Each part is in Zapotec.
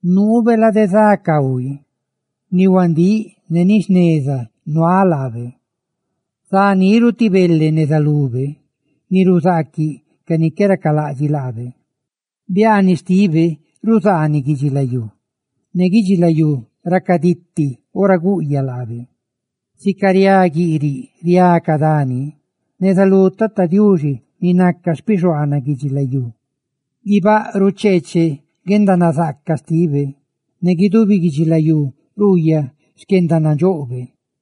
Nuube lade za cahui; ni huandíꞌ ne ni jneza nuaꞌ laabe; zá niru ti bele neza lube ni ruzaaquiꞌ ca ni qué racalaꞌdxiꞌ laabe. Biaaniꞌ xtibe ruzaaniꞌ guidxilayú; ¡ne guidxilayú racaditi ora guꞌyaꞌ laabe! Sica riá guiꞌriꞌ riá ca dani neza lú Tata Diuxi, ni naca xpixuaanaꞌ guidxilayú. Guibáꞌ rucheeche guendanazaaca xtibe; ne guidubi guidxilayú ruuyaꞌ xquendanandxoꞌbe.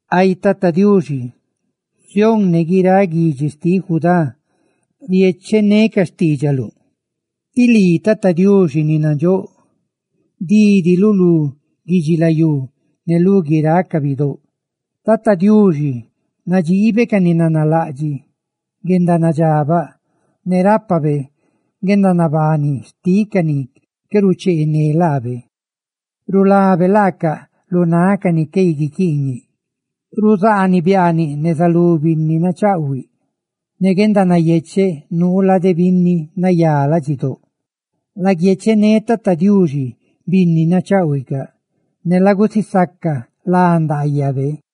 Ay Tata Diuxi, Sión ne guiráꞌ guidxi xtiꞌ Judá riéchecaꞌ ne ca xtiidxaluꞌ; tí lii, Tata Diuxi ni nandxóꞌ, dídiluꞌ lú guidxilayú ne lú guiráꞌ ca bidóꞌ. Tata Diuxi nadxiibe ca ni nanalaꞌdxiꞌ guendanadxabaꞌ; ne rápabe guendanabani xtiꞌ ca ni qué rucheené laabe; rulabe laaca lu náꞌ ca ni qué guiquiiñe. Ruzaaniꞌ biaaniꞌ neza lú binni nachaꞌhuiꞌ; guendanayecheꞌ nuu lade binni nayá ladxidóꞌ. ¡Laguiechené Tata Diuxi, binni nacháꞌhuicaꞌ, ne lagusisaca lá ndaayabe!